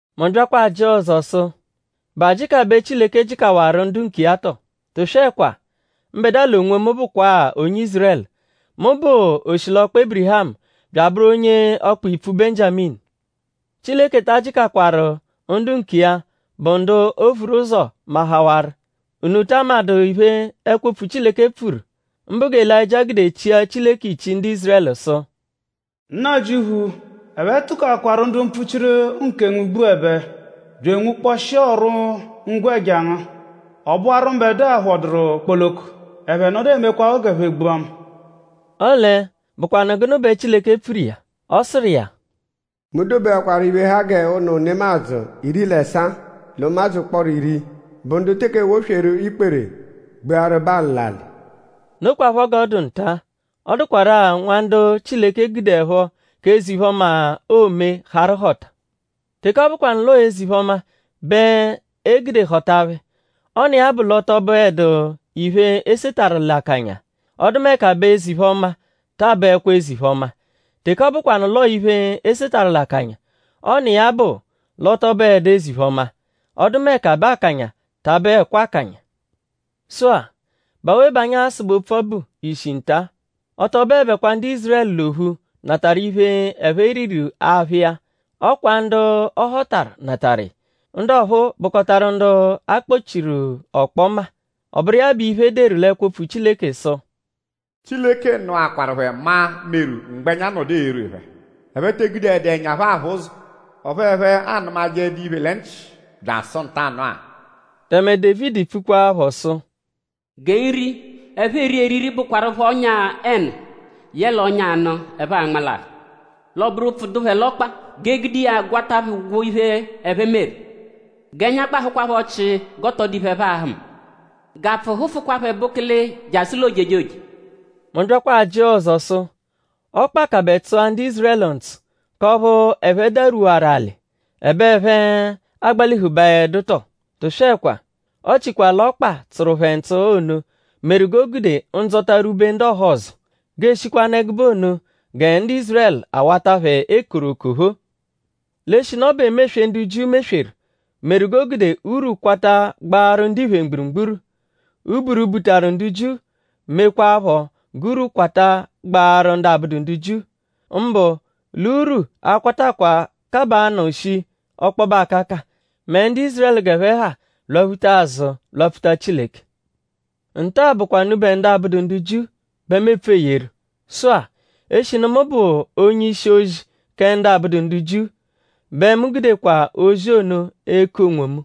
Mu byakwa ajịa ọzo sụ:?Bụ ajịka bẹ Chileke jịkawaru ndu nkiya tọo? Tụswekwa! Mbẹdua l'onwomu bụkwa-a onye Ízurẹlu. Mu bụ oshilọkpa Ébirihamu; bya abụru onye ọkpa-ipfu Benjiaminu. Chileke ta ajịkakwaru ndu nkiya, bụ ndu o vuru ụzo mahawarụ.?Unu ta amadụ iphe, ẹkwo-opfu Chileke pfuru; mbụ gẹ Elayịjia gude chia Chileke ichi ndu Ízurẹlu sụ: “Nnajịuphu; ẹphe tụkoakwaru ndu mpfuchiru nkengu gbuẹbe; bya enwukpọshia ọru-ngwẹja ngu. Ọ bụwaru mbẹdua phọduru kpoloko; ẹphe nọdu emekwaphọ g'ẹphe gbua mu.” Ọle,?Bụkwanu gụnu bẹ Chileke pfuru iya? Ọ sụru iya: “Mu dobekwaru iphe, ha g'ụnu nemadzụ iri l'ẹsaa l'ụmadzu ụkporo iri, bụ ndu teke ewosweeru ikpere gbuaru Balụ l'alị.” Nokwaphọ g'ọ dụ nta. Ọ dụkwaru-a nwa ndu Chileke gudeẹpho k'eze-iphe-ọma, oome harụ họta. Teke ọ bụkwanu l'ọo eze-iphe-ọma bẹ e gude họta phẹ; ọ n'iya-a bụ l'ọ tọ bụedu iphe, e setarụ l'akanya; ọdumeka bẹ eze-iphe-ọma ta abụekwa eze-iphe-ọma. Teke ọ bụkwanu l'ọo iphe, e setarụ l'akanya; ọ n'iya-a bụ l'ọ tọ bụedu eze-iphe-ọma; ọdumeka bẹ akanya ta abụekwa akanya. Sụ-a;?bụ awe bẹ anyi a-sụbe opfu ọbu ishi nta-a? Ọ tọ bụebekwa ndu Ízurẹlu l'ophu natarụ iphe, ẹphe riru aphụ iya; ọ kwa ndu a họtaru natarụ iya. Ndu ọphuu bụkotaru ndu a kpọ-chiru ọkpoma. Ọ bụru iya bụ iphe, e deru l'ẹkwo-opfu Chileke sụ: “Chileke nụakwaru phẹ maa meru mgbẹnya nọdu erwe phẹ. Ẹphe te egudeẹdu ẹnya aphụ ụzo; ọphu ẹphe anụmajeedu iphe lẹ nchị byasụ ntanụ-a.” Tẹme Dévidi pfukwaaphọ sụ: “Gẹ nri, ẹphe eri eriri bụkwaru phẹ ọ́nyà-ẹnu yẹle ọ́nyà-anụ, ẹphe a-nmalahụ. L'ọ bụru ụpfu dụ phẹ l'ọkpa; g'e gude iya gwata phẹ ụgwo iphe, ẹphe meru. G'ẹnya gbahụkwa phẹ ọchii g'ọ tọ dụ iphe, ẹphe a-hụma. G'apfụ hụfukwa phẹ bụkilii jasụ l'ojejoje.” Mu byakwa ajịa ọzo sụ:?ọkpa kabẹ tsụa ndu Ízurẹlu ntsụ k'ọphu ẹphe darwuwaru alị; ẹbe ẹphe agbalihubaẹdu tọo? Tụswekwa! Ọchikwa l'ọkpa, tsụru phẹ ntsụ ono meru g'o gude ndzọta rwube ndu ọhozo; g'eeshikwanụ ẹgube ono gẹ ndu Ízurẹlu awata phẹ ekoru okophoo. L'eshinu ọ bụ emeswe, ndu Jiu mesweru meru g'o gude urwu kwata gbaaru ndiphe mgburugburu. Uburu, butaru ndu Jiu mekwaaphọ g'urwu kwata gbaaru ndu abụdu ndu Jiu. Mbụ l'urwu a-kwatakwa kabaanụ shii ọkpobe akaka mẹ ndu Ízurẹlu g'ẹphe ha lwaphuta azụ lwapfuta Chileke. Nta-a bụkwa unubẹ ndu abụdu ndu Jiu bẹ mu epfu eyeru. Sụ-a; eshinu mu bụ onye-ishi-ozi kẹ ndu abụdu ndu Jiu; bẹ mu gudekwa ozi ono eku onwomu.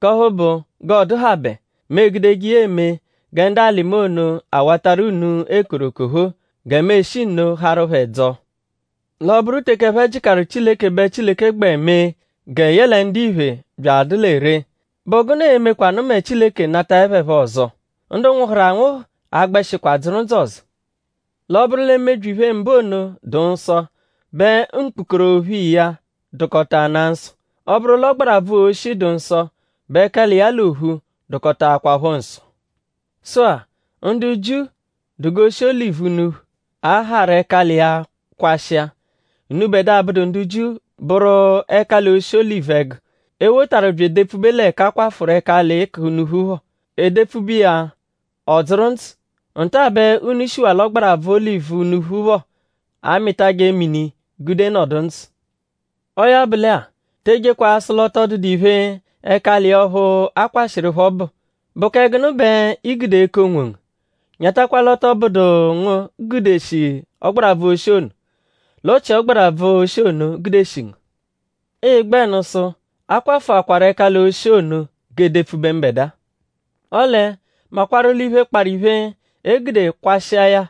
K'ọphu bụ; g'ọ dụhabe; mu egudeje iya eme gẹ ndu alị mu ono awatarụ unu ekoru okophoo; gẹ mu eshi nno harụ phẹ dzọo. L'ọ -bụru teke ẹphe jịkaru Chileke bẹ Chileke gbẹ mee gẹ yẹle ndiphe bya adụ lẹ ree;?bụ gụnu e-mekwanụ mẹ Chileke nataẹ phẹ phọ ọzo? Ndu nwụhuru anwụhu a-gbẹshikwa dzụru ndzụ ọzo. L'ọ -bụru lẹ mebyi-iphe-mbụ ono dụ nsọ; bẹ mkpukorophu iya dụkotanaa nsọ. Ọ -bụru l'ọgbarabvu-oshi dụ nsọ bẹ ẹkali iya l'ophu dụkotaakwapho nsọ. Sụ-a; ndu Jiu dụ g'oshi olivu unuphu, a harụ ẹkali iya kwashịa. Unubẹdua, abụdu ndu Jiu bụru ẹkali-oshi olivu ẹgu, e wotaru bya edepfube l'ẹka a kwafụru ẹkali k'unuphu phọ. E depfube iya; ọ dzụru ndzụ. Nta-a bẹ unu shiwa l'ọgbarabvu olivu unuphu phọ amịtaje mini gude nọdu ndzụ. Ọo ya bụ lẹ-a; te ejekwa asụ l'ọ tọ dụdu iphe, ẹkali iya ọphu a kwashịru phọ bụ.?Bụ kẹ gụnu bẹ ii-gude eku onwongu? Nyatakwa l'ọ tọ bụdu ngu gudeshi ọgbarabvu-oshi ono; l'ọ chia ọgbarabvu-oshi ono gudeshi ngu. Ịi-gbẹnu sụ: “A kwafụakwaru ẹkali-oshi ono; g'e depfube mbẹdua.” Ọle makwarụ l'iphe, kparụ iphe, e gude kwashịa ya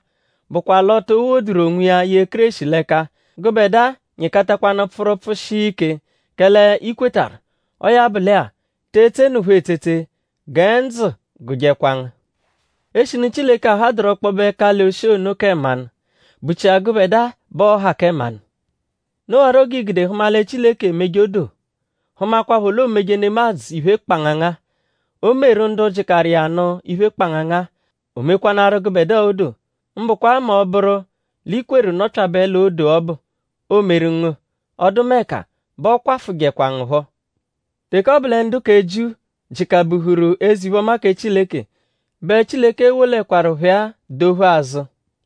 bụkwa l'o to woduru onwiya ye Kéreshi l'ẹka. Gụbedua nyịkatakwanu pfụru pfụshia ike; kẹle i kwetarụ. Ọo ya bụ lẹ-a; te etsenụpho etsetse; gẹ ndzụ gụjekwa ngu. Eshinu Chileke ahadụru ọkpobe ẹkali-oshi ono kẹ mmanụ;?bụ-chia gụbedua bẹ ọo-ha kẹ mmanụ? Nowarọ g'ii-gude hụma lẹ Chileke emeje odoo; hụmakwapho l'oomeje nemadzụ iphe kpangangaa. O meru ndu jịkaru iya nụ iphe kpangangaa. O mekwanaaru gụbedua odoo; mbụkwa mẹ ọ -bụru l'i kweru nọpyabe l'odoo ọbu, oomeru ngu; ọdumeka bẹ ọ kwafụjekwa ngu phọ. Teke ọ bụ lẹ ndu kẹ Jiu jịka-buhuru eze-iphe-ọma kẹ Chileke bẹ Chileke e-wolẹkwaru phẹ-a dophu azụ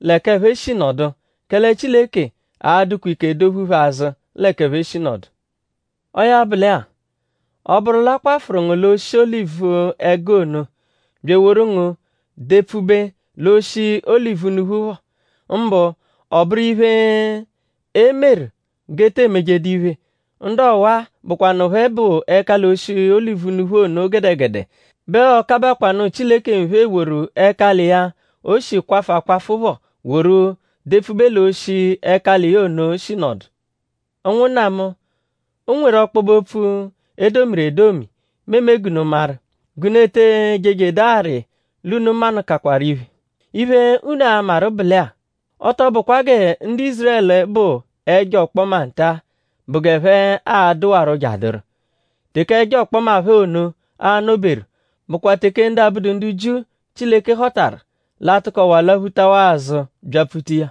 l'ẹka ẹphe shi nọdu; kẹle Chileke a-dụkwaa ike dophu phẹ azụ l'ẹka ẹphe shi nọdu. Ọo ya bụ lẹ-a; ọ -bụru l'a kwafụru ngu l'oshi olivu-ẹgu ono; bya eworu ngu depfube l'oshi olivu-unuphu phọ; mbụ ọ bụru iphe, e meru g'e te emejedu iphe; ndu ọwa-a, bụkwanu phẹ bụ ẹkali-oshi olivu-unuphu ono gẹdegede bẹ ọo-kabakwanụ Chileke nphe eworu ẹkali iya, o shi kwafụ akwafụ phọ woru depfube l'oshi, ẹkali iya ono shi nọdu. Ụnwunna mu; o nweru ọkpobe-opfu, e domiru edomi, mu eme g'unu maru; g'unu ete ejejedu arị l'unu manụkawaru iphe. Iphe, unu a-maru bụ lẹ-a; ọ tọ bụkwa gẹ ndu Ízurẹlu bụ ẹjo-ọkpoma nta-a bụ g'ẹphe a-dụwaro jeadụru. Teke ẹjo-ọkpoma phẹ ono a-nọ-beru bụkwa teke ndu abụdu ndu Jiu, Chileke họtaru l'a-tụkowa lwaphutawa azụ byapfuta iya.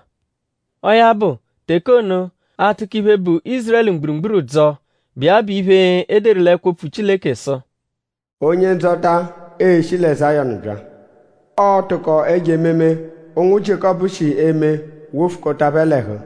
Ọo ya bụ; teke ono; aa-tụko iphe, bụ Ízurẹlu mgburugburu dzọo, bụ iya bụ iphe, e deru l'ẹkwo-opfu Chileke sụ: “Onye-Ndzọta e-shi lẹ Zayọnu bya. Ọo-tụko ẹjo ememe, ụnwu Jiékọpu shi eme wofukọta phẹ l'ẹhu.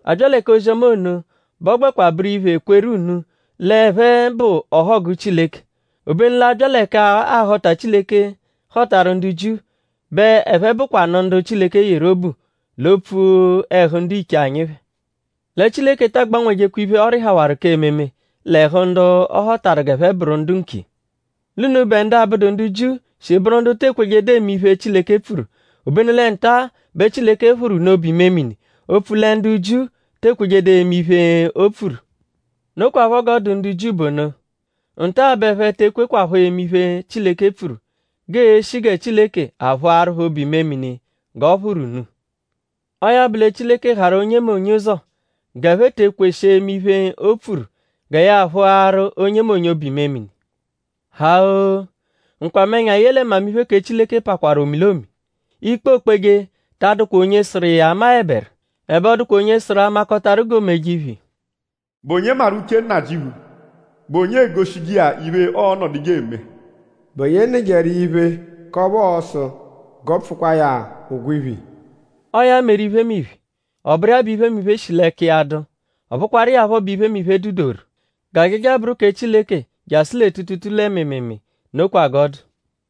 A -bya lẹ k'ozi-ọma ono bẹ ọ gbẹkwa bụru iphe kweru unu l'ẹphe bụ ọhogu Chileke. Obenu l'a -bya lẹ k'ahọta, Chileke họtaru ndu Jiu bẹ ẹphe bụkwanu ndu Chileke yeru obu l'opfu ẹhu ndiche anyi phẹ. Lẹ Chileke ta agbanwejekwa iphe, ọ rịhawaru k'ememe l'ẹhu ndu ọ họtaru g'ẹphe bụru ndu nkiya. L'unubẹ ndu abụdu ndu Jiu shi bụru ndu te kwejedu eme iphe, Chileke pfuru; obenu lẹ nta-a bẹ Chileke phụru unu obu-imemini opfu lẹ ndu Jiu te ekwejedu eme iphe, o pfuru. Nokwaphọ g'ọ dụ ndu Jiu bụ ono. Nta-a bẹ ẹphe te ekwekwaphọ eme iphe, Chileke pfuru g'ee-shi gẹ Chileke aphụaru phẹ obu-imemini g'ọ phụru unu. Ọo ya bụ lẹ Chileke harụ onyemonye ụzo g'ẹphe te ekweshi eme iphe, o pfuru gẹ ya a-phụaru onyemonye obu-imemini. Ha-oo! nkwamẹnya yẹle mmamiphe kẹ Chileke pakwarụ omilomi. Ikpe, ookpeje ta adụkwa onye sụru iya amaẹberu; ẹbe ọ dụkwa onye sụru amakọtaru g'o meje iphe iya. “?Bụ onye maru uche Nnajịuphu??Bụ onye egoshije iya iphe, ọo-nọduje eme? ?Bụ onye nụjeru iya iphe; k'ọphu ọo-sụ g'ọ pfụkwaa ya ụgwo iphe iya?” Ọo ya meru iphemiphe. Ọ bụru iya bẹ iphemiphe shi l'ẹka iya dụ; ọ bụkwaru iya phọ bẹ iphemiphe, dụ dụ-doru. G'ajaja bụru kẹ Chileke jasụ lẹ tuutuutuu lẹ mịimiimii. Nokwa g'ọ dụ.